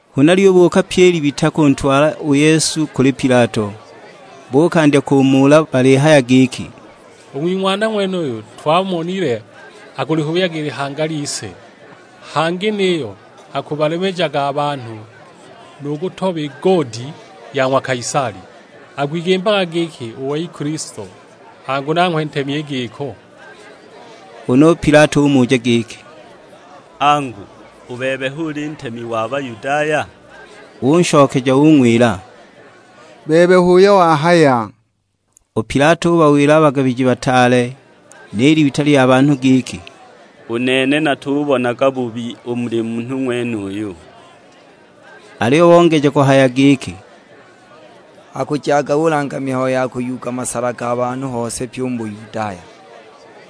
Huna lyubuuka pyi i libita kuntwala u Yesu kuli Pilato, buukandya kumuula balihaya giki, "U ng'wing'wana ng'wenuyu twamonile akulihubyaga i lihanga lise; hangi niyo akubalemejaga a banhu nu kutoba i goodi ya ng'wa Kaisali, akwigimbaga giki u wei Kilisto, angu nanghwe ntemi i giko!" Huna u Pilato umuja giki, "Angu u bebe hu uli ntemi wa Bayudaya?" Unshokeja ung'wila, "Bebe h'uyo wahaya!" U Pilato ubawila a bagabiji bataale ni libita lya banhu giki, "U nene natubonaga bubi u muli munhu ng'wenuyu!" Aliyo bongeja kuhaya giki, "Akujaga ulanga mihayo ya kuyuuga masala ga banhu hose pye u mu Buyudaya;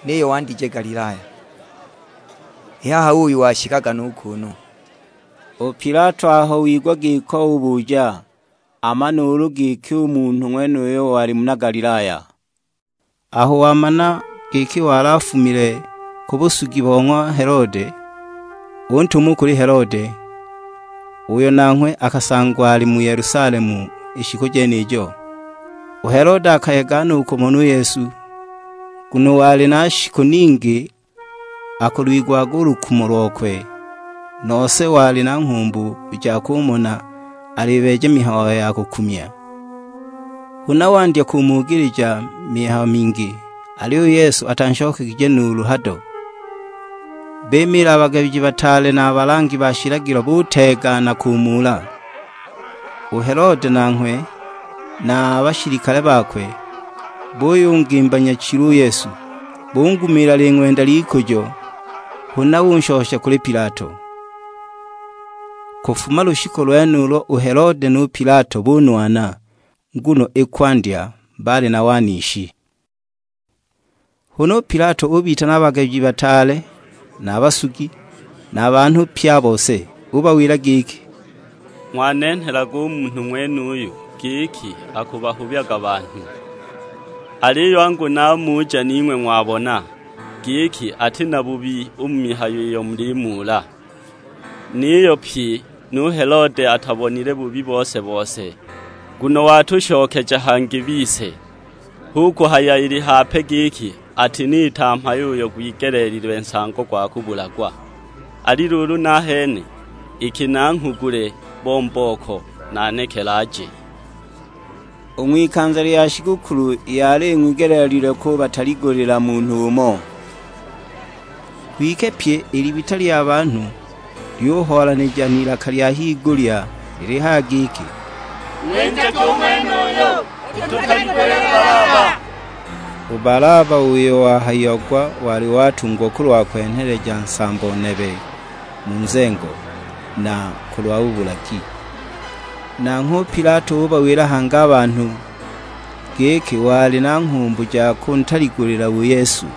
niyo wandigije Galilaya. I haha uuyu washikaga nu kuunu!" U Pilato aho wigwa giko ubuja, amane ulu giki u munhu ng'wenuyo wali muna Galilaya. Aho wamana giki wali afumile ku busugi bo ng'wa Helode, untuma u kuli Helode, uyo nanghwe akasangwa ali mu Yelusalemu i shiku jenijo. U Helode akayega no u kumona u Yesu, nguno wali na shiku ningi akulwigwaga u lukumo lokwe; nose wali na nghumbu ja kumona alibeeja mihayo ya kukumya. Huna wandya kumugilija mihayo mingi; aliyo u Yesu atanshokegije nuulu hado. Bimiila a bagabiji bataale na a balangi ba shilagilo buteegana kumuula. U Helode nanhgwe na a bashilikale bakwe, buyungimba nyachilu u Yesu. Bungumiila ling'wenda ly'ikujo, huna unshosha kuli Pilato. Kufuma lushiku lwenulo u Helode nu Pilato bunwana, nguno i kwandya baali na wanishi. Huna u Pilato ubitana a bagabiji bataale na a basugi, na a banhu pye a bose. Ubawila giki, "Ng'wanenhelaga u munhu ng'wenuyu, giki akuhubyaga banhu; aliyo angu namuja ning'we ng'wabona, giki ati na bubi u mu mihayo iyo mulimuula. Niyo pyi nu Helode atabonile bubi bose-bose, nguno watushokeja hangi bise; hu kuhaya ili hape giki atiniita mhayo uyo gwigeleelilwe nsango gwa kubulagwa. Ali luulu nahene, iki nanghugule bo mbooko, nanekele aje!" [ U ng'wikanza lya shigukulu yali ing'wigeleelile kubataligulila munhu umo.] Kwike pyi i libita lya banhu lyuhoolanija n'ilaka lya higulya lilihaya giki, "Ng'winjage u ng'wenuyu, ututaligulile Balaba." U Balaba uyo wahayiagwa wali watungwa kulwa kwenheleja nsambo nebe mu nzengo, na kulwa bubulagi. Nanghwe u Pilato ubawila hangi a banhu, giki wali na nghumbu ja kuntaligulila u Yesu.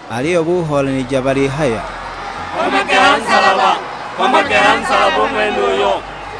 Aliyo buhoolanija balihaya, "Nkomage ha nsalaba, nkomage ha nsalaba u ng'wenuyo!"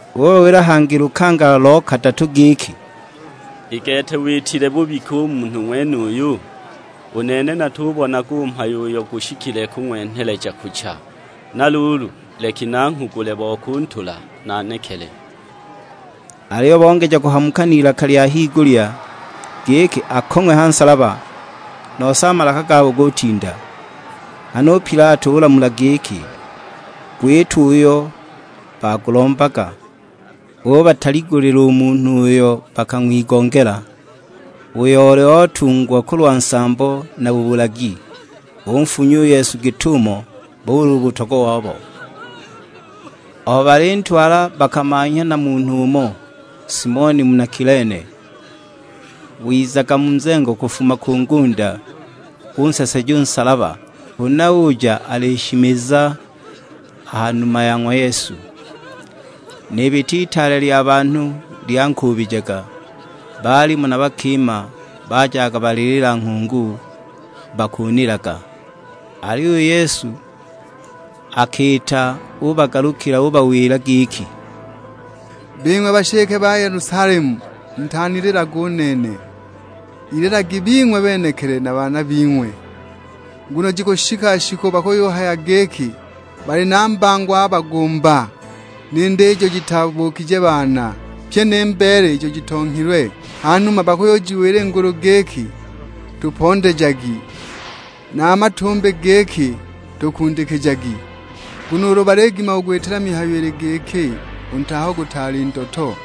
Ubawila hangi lukangala lo kadatu giki, "I gete witile bubi ki u munhu ng'wenuyu? U nene natugubonaga u mhayo uyo gushikile kung'wenheleja kucha; na luulu leki nanghugule bo kuntula nanekele!" Aliyo bongeja kuhamuka n'ilaka lya higulya, giki akong'we ha nsalaba; nose a malaka gabo gutinda. Nghana u Pilato ulamula giki gwitwe uyo bagulombaga. Ubataligulila u munhu uyo bakang'wigongela, uyo oli otungwa kulwa nsambo na bubulagi; unfunya u Yesu git'umo boli u utogwa wabo. Aho balintwala bakamanhya na munhu umo, Simoni muna Kilene, wizaga mu nzengo kufuma ku ngunda, bunseseja u nsalaba, huna uja alishimiza a ha numa ya ng'wa Yesu. N'ibita itaale lya banhu lyankuubijaga; baalimo na bakima bajaga balilila nghungu, bakunilaga! Aliyo u Yesu akiita ubagalukila ubawila giki, "Bing'we bashike ba Yelusalemu mutanililage u nene, ililagi bing'we benekili na baana bing'we. Nguno jikushika shiku bakuyuhaya giki, 'Bali na mbango a bagumba, ni nda ijo jitabuukije baana, pyi ni mbeele ijo jitonghilwe.' Hanuma bakuyujiwila ngulu giki, 'Tupondejagi;' na a matumbi giki, 'Tukundikijagi!' Nguno ulu baligima kugwitila mihayo ili giki u nti aho gutaali ndoto,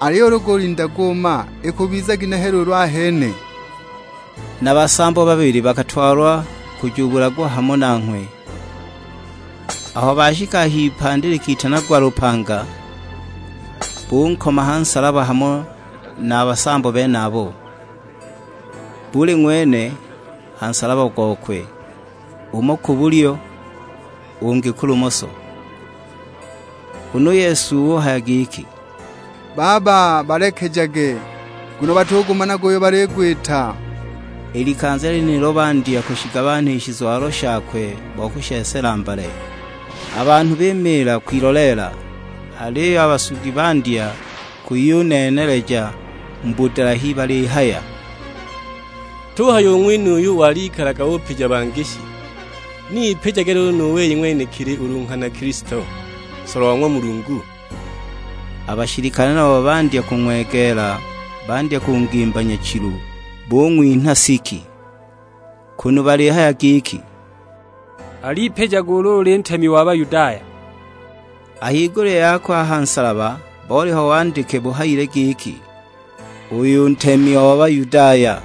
aliyo ulu gulinda guuma, ikubiza ginehe luulu ahene!" Na basambo babili bakatwalwa kujubulagwa hamo nanghwe. Aho bashika h'ipandi likitanagwa lupanga, bunkoma ha nsalaba hamo na a basambo benabo; buli ng'wene ha nsalaba gokwe, umo ku bulyo, ungi ku lumoso! Huna u Yesu uhaya giki, "Baba balekejage, nguno batugumanaga uyo baligwita." I likanza lyenilo bandya kushigabanha i shizwalo shakwe bo kushesela mbale. A banhu bimiila kwiloleela, aliyo a basugi bandya kuyuneeneleja mu budalahi balihaya, "Tuhaya u ng'wenuyu walikalaga upija bangi shi, ni ipijage luulu nu wei ng'wenekili ulu nghana Kilisto, nsolwa wa ng'wa Mulungu!" A bashilikale nabo bung'wegeela bandya kungimba nyachilu, bung'winha siki; kunu balihaya giki, "Al'ipijage ulu uli ntemi wa Bayudaya!" A higulya yakwe a ha nsalaba boliho wandike buhayile giki, "Uyu ntemi o Bayudaya."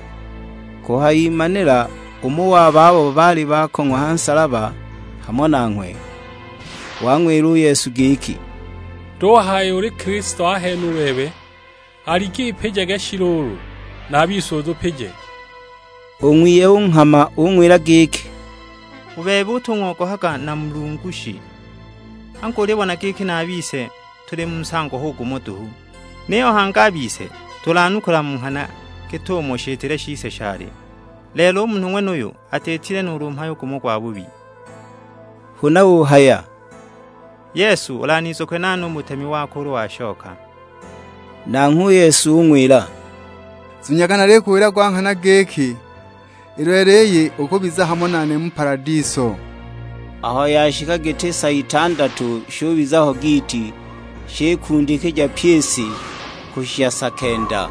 Kuhayimanila, umo wa babo baali bakong'wa ha nsalaba hamo nanghwe, wang'wila u Yesu giki, "Tuhaya uli Kilisto ahene u bebe? Alik'ipijage shi luulu, na a bise utupije!" U ng'wiye unghama; ung'wila giki, "U bebe utung'ogohaga na Mulungu shi? Angu ulibona giki na a bise tuli mu nsango hu gumo duhu! Niyo hangi a bise tulanukula mu nghana git'umo shitile shise shali; lelo u munhu ng'wenuyu atiitile nuulu mhayo gumo gwabubi!" Huna uhaya, "Yesu, ulanizukwe nane u mu butemi wako ulu washoka!" Nanghwe u Yesu ung'wila, "Zunyaga nalikuwila gwa nghana giki, i lelo iyi ukubiza hamo nane mu paladiso." Aho yashika giti sa itandatu shubiza ho giiti, shikundikija pyi i si, kushisha sa kenda.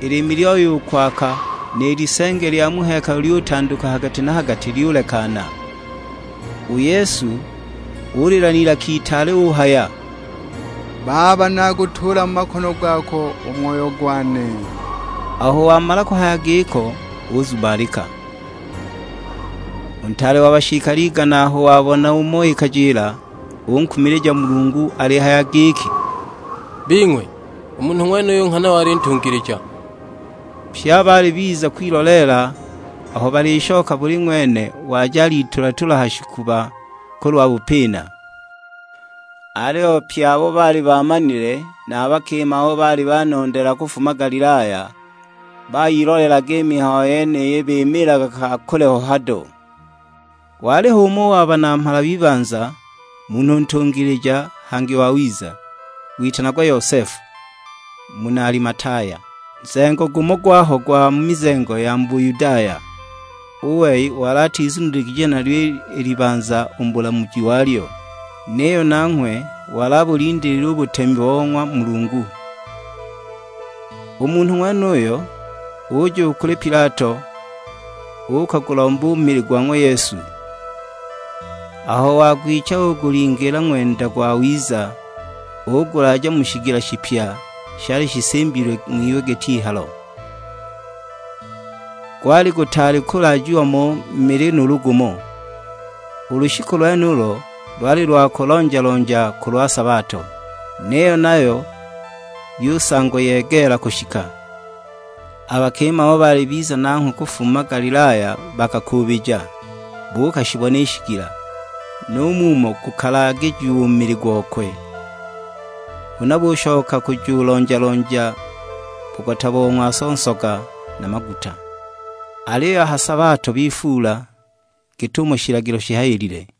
I liimi lyoya u kwaaka, ni lisenge lya mu hekalu lyutanduka ha gati na ha gati lyulekana. U Yesu ulila n'ilaka itaale uhaya, "Baba nagutuula mu makono gako u moyo gwane!" Aho wamala kuhaya giko uzumalika! U ntaale wa bashilikale igana aho wabona umo ikajila, unkumilija Mulungu alihaya giki, "Bing'we, u munhu ng'wenuyu nghana wali ntungilija!" Pye abo baali biza kwiloleela aho balishoka buli ng'wene waja alitula-tula ha shikuba kulwa bupina. Aliyo pye abo baali baamanile, na a bakima abo baali banondeela kufuma Galilaya, bayiloleelaga i mihayo yeniyi bimiilaga ka kule ho hado. Waliho umo wa banamhala b'ibanza; munhu ntungilija, hangi wawiza. Witanagwa Yosefu, muna Alimataya; nzengo gumo gwaho gwa mu mizengo ya Buyudaya. U wei wali atizuniligije nalyo i libanza u mu bulamuji walyo; niyo nanghwe wali abulindiilile u butemi bo ng'wa Mulungu. U munhu ng'wenuyo uja u kuli Pilato uukagulomba u mili gwa ng'wa Yesu. Aho wagwicha ugulingiila ng'wenda gwawiza ugulaaja mu shigila shipya shali shisimbilwe ng'wiwe git'ihalo. Gwali gutaali kulaajiwa mo mili nuulu gumo. U lushiku lwenulo lwali lwa kulonja-lonja kulwa sabato; niyo nayo yusangwa yegeela kushika. A bakima abo baali biza nanghwe kufuma Galilaya bakakuubija, buukashibona i shigila, nu mumo gukalaagijiwa u mili gokwe. Huna bushoka kujulonja-lonja bugota bo ng'waso nsoga na maguta. Aliyo a ha sabato bifuula, git'umo shilagilo shihayilile.